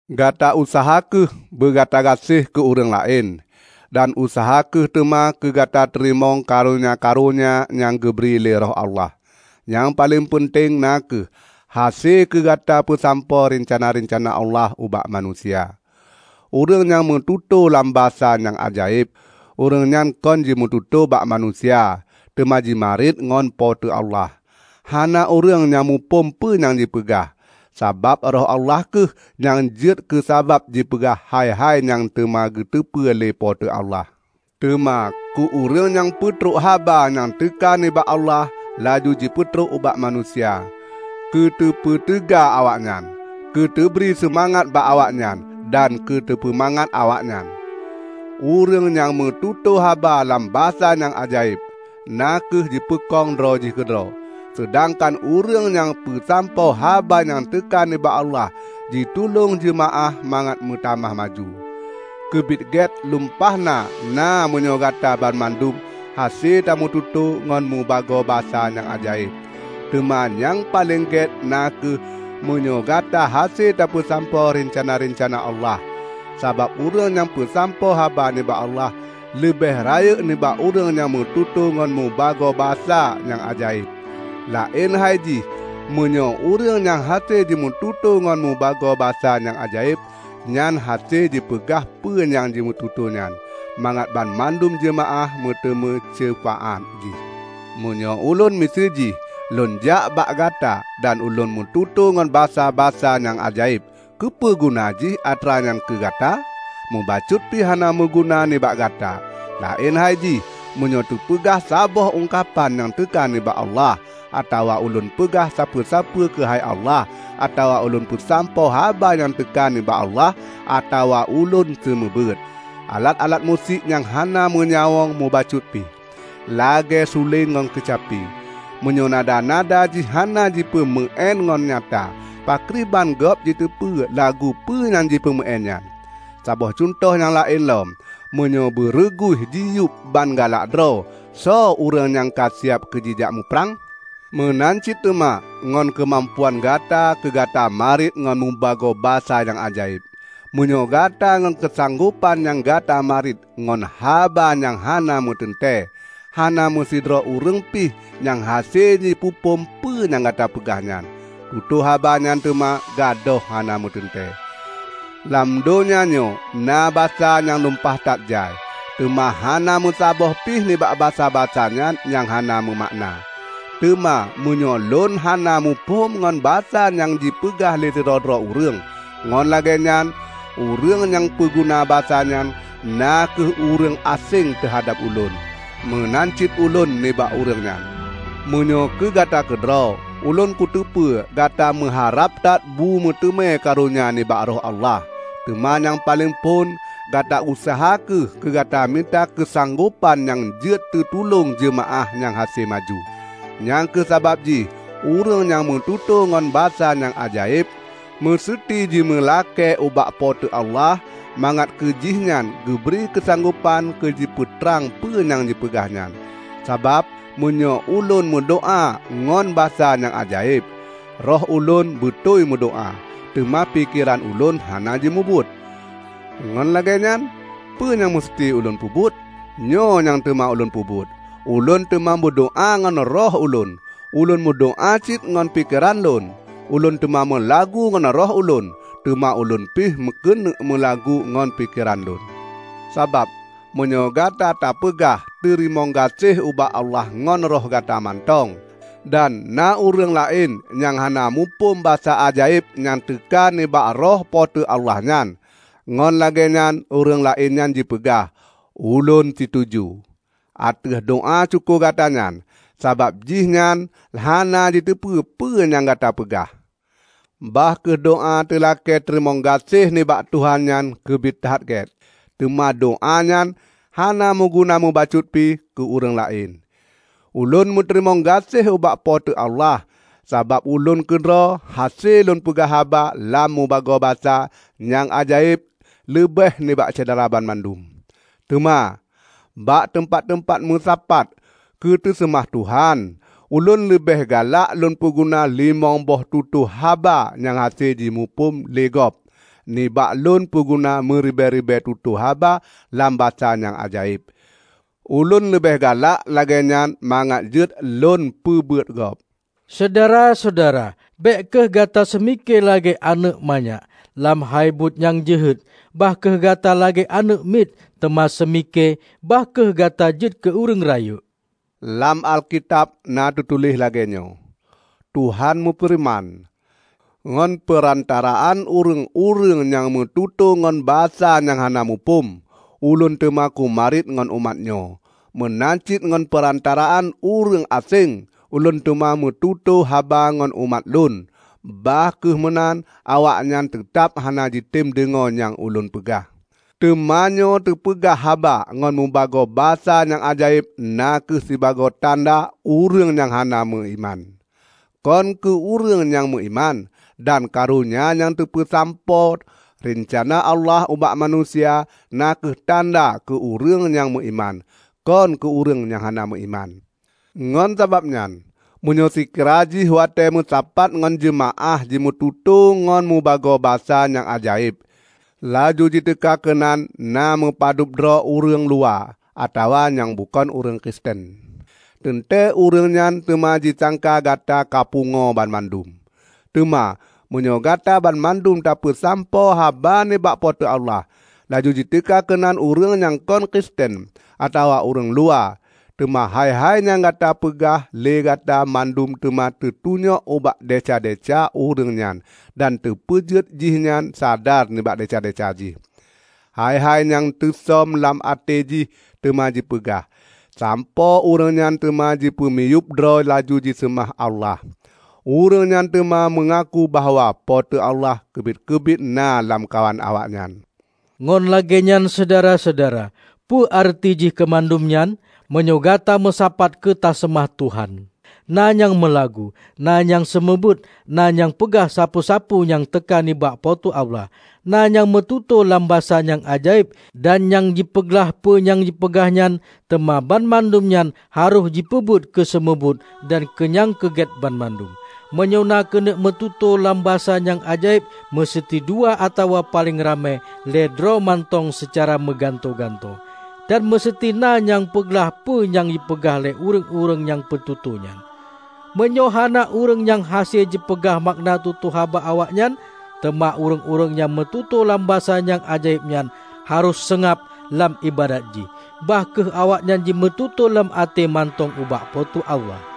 Gata useuha kheueh beugata gaséh keu ureuëng laén. Dan useuha kheueh teuma keu gata teurimong karonya-karonya nyang geubri lé Roh Allah, nyang paleng peunteng na kheueh hase keu gata peusampoe reuncana-reuncana Allah ubak manusia. Ureuëng nyang meututoe lam basa nyang ajaéb, ureuëng nyan kon jimeututoe bak manusia; teuma jimarit ngon Po teu Allah. Hana ureuëng nyang muphom peue nyang jipeugah, sabab Roh Allah kheueh nyang jeuet keusabab jipeugah hai-hai nyang teuma geuteupeue lé Po teu Allah. Teuma keu ureuëng nyang peutrok haba nyang teuka nibak Allah, laju jipeutrok ubak manusia; keu teupeuteuga awaknyan, keu teubri seumangat bak awaknyan dan keu teupeumangat awaknyan. Ureuëng nyang meututoe haba lam basa nyang ajaéb na kheueh jipeukong droe jih keudroe, seudangkan ureuëng nyang peusampoe haba nyang teuka nibak Allah jitulông jeumaáh mangat meutamah maju. Keubiet gét lumpah na meunyoe Gata banmandum hase tameututoe ngon mubagoe basa nyang ajaéb. Teuma nyang paleng gét na kheueh meunyoe Gata hase tapeusampoe reuncana-reuncana Allah. Sabab ureuëng nyang peusampoe haba nibak Allah, leubeh rayeuk nibak ureuëng nyang meututoe ngon mubagoe basa nyang ajaéb; laén hai jih meunyoe ureuëng nyang hase jimeututoe ngon mubagoe basa nyang ajaéb nyan hase jipeugah peue nyang jimeututoe nyan, mangat banmandum jeumaáh meuteumé ceufaát jih. Meunyoe ulôn miseue jih lôn jak bak gata dan ulôn meututoe ngon basa-basa nyang ajaéb, keupeue guna jih atra nyan keu gata? Mubacut pih hana meuguna nibak gata! Laén hai jih, meunyoe teupeugah saboh ungkapan nyang teuka nibak Allah, atawa ulôn peugah sapeue-sapeue keuhai Allah, atawa ulôn peusampoe haba nyang teuka nibak Allah, atawa ulôn seumeubeuet. Alat-alat musik nyang hana meunyawöng mubacut pi, lagée suleng ngon keucapi, meunyoe nada-nada jih hana jipeumeuén ngon nyata, pakriban gob jiteupeu lagu peue nyang jipeumeuén nyan? Saboh cuntoh nyang laén lom: meunyoe beureuguih jiyueb ban galak droe, soe ureuëng nyang ka siab keujijak muprang? Meunan cit teuma ngon keumampuan Gata keu gata mariet ngon mubagoe basa nyang ajaéb. Meunyoe gata ngon keusanggopan nyan gata mariet ngon haba nyang hana meuteuntée, hana meusidroe ureuëng pih nyang hase jipeuphom peue nyang Gata peugah nyan. Tutoe haba nyan teuma gadôh hana meuteuntée. Lam donya nyoe na basa nyang lumpah that jai, teuma hana meusaboh pih nibak basa-basa nyan nyang hana meumakna. Teuma meunyoe ulôn hana muphom ngon basa nyang jipeugah lé sidroe-droe ureuëng, ngon lagée nyan, ureuëng nyang peuguna basa nyan na kheueh ureuëng aséng teuhadab ulôn; meunan cit ulôn nibak ureuëng nyan. Meunyoe keu gata keudroe, ulôn kuteupeu gata meuharab that bumeuteumé karonya nibak Roh Allah. Teuma nyang paleng phon, gata useuha kheueh keugata mita keusanggopan nyang jeuet teutulông jeumaáh nyang hase maju. Nyang kheueh sabab jih ureuëng nyang meututoe ngon basa nyang ajaéb, meuseuti jimeulakée ubak Po teu Allah mangat keujih nyan geubri keusanggopan keu jipeutrang peue nyang jipeugah nyan. Sabab meunyoe ulôn meudoá ngon basa nyang ajaéb, roh ulôn beutôi meudoá, teuma pikeran ulôn hana jimubuet. Ngon lagée nyan, peue nyang meuseuti ulôn peubuet? Nyoe nyang teuma ulôn peubuet: Ulôn teuma meudoá ngon roh ulôn, ulôn meudoá cit ngon pikeran lôn. Ulôn teuma meulagu ngon roh ulôn, teuma ulôn pih keuneuek meulagu ngon pikeran lôn. Sabab meunyoe Gata tapeugah teurimong gaséh ubak Allah ngon roh gata mantong, dan na ureuëng laén nyang hana muphom basa ajaéb nyang teuka nibak Roh Po teu Allah nyan, ngon lagée nyan ureuëng laén nyan jipeugah, "Ulôn situju" ateueh doá syukoe gata nyan; sabab jih nyan hana jiteupeu peue nyang Gata peugah. Bah kheueh doá teulakée teurimong gaséh nibak Tuhan nyan keubiet that gét, teuma doá nyan hana meuguna mubacut pi keu ureuëng laén. Ulôn meuteurimong gaséh ubak Po teu Allah sabab ulôn keudroe hase lôn peugah haba lam mubagoe basa nyang ajaéb leubeh nibak Syedara banmandum. Teuma, bak teumpat-teumpat meusapat keuteuseumah Tuhan, ulôn leubeh galak lôn peuguna limong boh tutoe haba nyang hase jimuphom lé gob nibak lôn peuguna meuribée-ribée tutoe haba lam basa nyang ajaéb. Ulôn leubeh galak lagée nyan mangat jeuet lôn peubeuet gob. Syedara-syedara! Bék kheueh gata seumike lagée aneuëk manyak. Lam hai buet nyang jeuhet, bah kheueh gata lagée aneuëk miet. Teuma seumike, bah kheueh gata jeuet keu ureuëng rayeuk. Lam Alkitab na teutuléh lagée nyoe, "Tuhan meufeureuman, 'Ngon peurantaraan ureuëng-ureuëng nyang meututoe ngon basa nyang hana muphom, Ulôn teuma kumariet ngon umat nyoe. Meunan cit ngon peurantaraan ureuëng aséng, Ulôn teuma meututoe haba ngon umat Lôn; bah kheueh meunan, awaknyan teutab hana jitem deungoe nyang ulôn peugah.' " Teumanyoe teupeugah haba ngon meubagoe basa nyang ajaéb na kheueh sibagoe tanda ureuëng nyang hana meuiman, kon keue ureuëng nyang meuiman. Dan karonya nyang teupeusampoe reuncana Allah ubak manusia na kheueh tanda keu ureuëng nyang meuiman, kon keu ureuëng nyang hana meuiman. Ngon sabab nyan, meunyoe seukira jih watée meusapat ngon jeumaáh jimeututoe ngon mubagoe basa nyang ajaéb, laju jiteuka keunan na meupadub droe ureuëng luwa, atawa nyang bukon ureuëng Kristen, teuntée ureuëng nyan teuma jisangka gata kapungoe banmandum! Teuma meunyoe Gata banmandum tapeusampoe haba nibak Po teu Allah, laju jiteuka keunan ureuëng nyang kon Kristen atawa ureuëng luwa, teuma hai-hai nyang Gata peugah lé gata mandum teuma teutunyok ubak desya-desya ureuëng nyan dan teupeujeuet jihnyan sadar nibak desya-desya jih. Hai-hai nyang teusöm lam até jih teuma jipeugah, sampoe ureuëng nyan teuma jipeumiyueb droe laju jiseumah Allah. Ureuëng nyan teuma meungaku bahwa Po teu Allah keubiet-keubiet na lamkawan awaknyan. Ngon lagée nyan syedara-syedara, peue areuti jih keumandum nyan? Meunyoe gata meusapat keu taseumah Tuhan, na nyang meulagu, na nyang seumeubeuet, na nyang peugah sapeue-sapeue nyang teuka nibak Po teu Allah, na nyang meututoe lam basa nyang ajaéb, dan nyang jipeuglah peue nyang jipeugah nyan. Teuma banmandum nyan harôh jipeubuet keu seumeubeuet dan keu nyang keugét banmandum. Meunyoe na keuneuk meututoe lam basa nyang ajaéb, meuseuti dua atawa paleng ramé lhée droe mantong seucara meugantoe-gantoe. Dan meuseuti na nyang peuglah peue nyang jipeugah lé ureuëng nyang meututoe nyan. Meunyoe hana ureuëng nyang hase jipeugah makna tutoe haba awaknyan, teuma ureuëng-ureuëng nyang meututoe lam basa nyang ajaéb nyan harôh seungab lam iébadat jih. Bah kheueh awaknyan jimeututoe lam até mantong ubak Po teu Allah.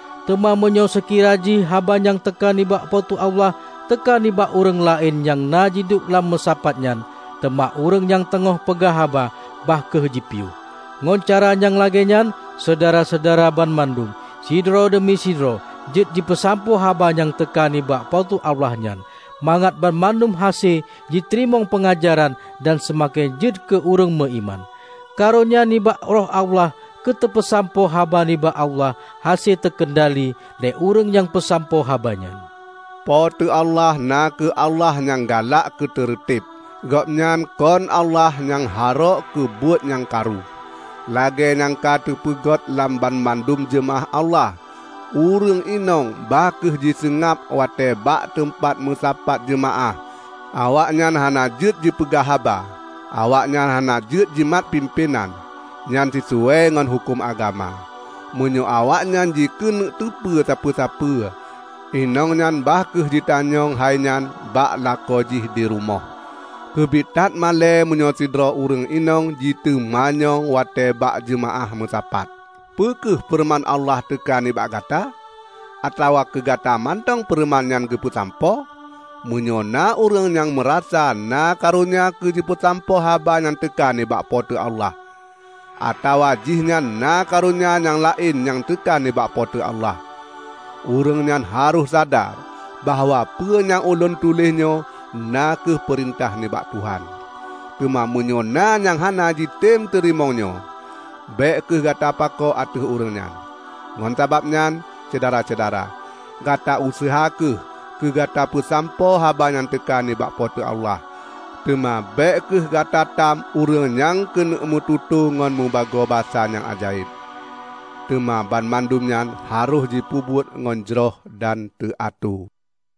Teuma meunyoe seukira jih haba nyang teuka nibak Po teu Allah teuka nibak ureuëng laén nyang na jiduek lam meusapat nyan, teuma ureuëng nyang teungoh peugah haba, bah kheueh jipiôh. Ngon cara nyang lagée nyan, Syedara-syedara banmandum, sidroe deumi sidroe, jeuet jipeusampoe haba nyang teuka nibak Po teu Allah nyan; mangat banmandum hase jiteurimong peungajaran dan seumaken jeuet keu ureuëng meuiman. Karonya nibak Roh Allah keuteupeusampoe haba nibak Allah hase teukeundali lé ureuëng nyang peusampoe haba nyan. Po teu Allah na kheueh Allah nyang galak keuteureuteb; Gobnyan kon Allah nyang harôk keu buet nyang karu. Lagée nyang ka teupeugét lam banmandum jeumaáh Allah, ureuëng inong bah kheueh jiseungab watée bak teumpat meusapat jeumaáh. Awaknyan hana jeuet jipeugah haba. Awaknyan hana jeuet jimat pimpénan; nyan sisuai ngon huköm agama. Meunyoe awaknyan jikeuneuk teupeue sapeue-sapeue, inong nyan bah kheueh jitanyong hainyan bak lakoe jih di rumoh. Keubiet that malée meunyoe sidroe ureuëng inong jiteumanyong watée bak jeumaáh meusapat. Peu kheueh feureuman Allah teuka nibak gata? Atawa keugata mantong feureuman nyan geupeusampoe? Meunyoe na ureuëng nyang meurasa na karonya keu jipeusampoe haba nyang teuka nibak Po teu Allah, atawa jihnyan na karonya nyang laén nyang teuka nibak Po teu Allah, ureuëng nyan harôh sadar bahwa peue nyang ulôn tuléh nyoe na kheueh peurintah nibak Tuhan. Teuma meunyoe na nyang hana jitem teurimong nyoe, bék kheueh gata pakoe ateueh ureuëng nyan. Ngon sabab nyan, Syedara-syedara, gata useuha kheueh keu gata peusampoe haba nyang teuka nibak Po teu Allah, teuma bék kheueh gatatam ureuëng nyang keuneuk meututoe ngon mubagoe basa nyang ajaéb. Teuma banmandum nyan harôh jipeubuet ngon jroh dan teuatoe.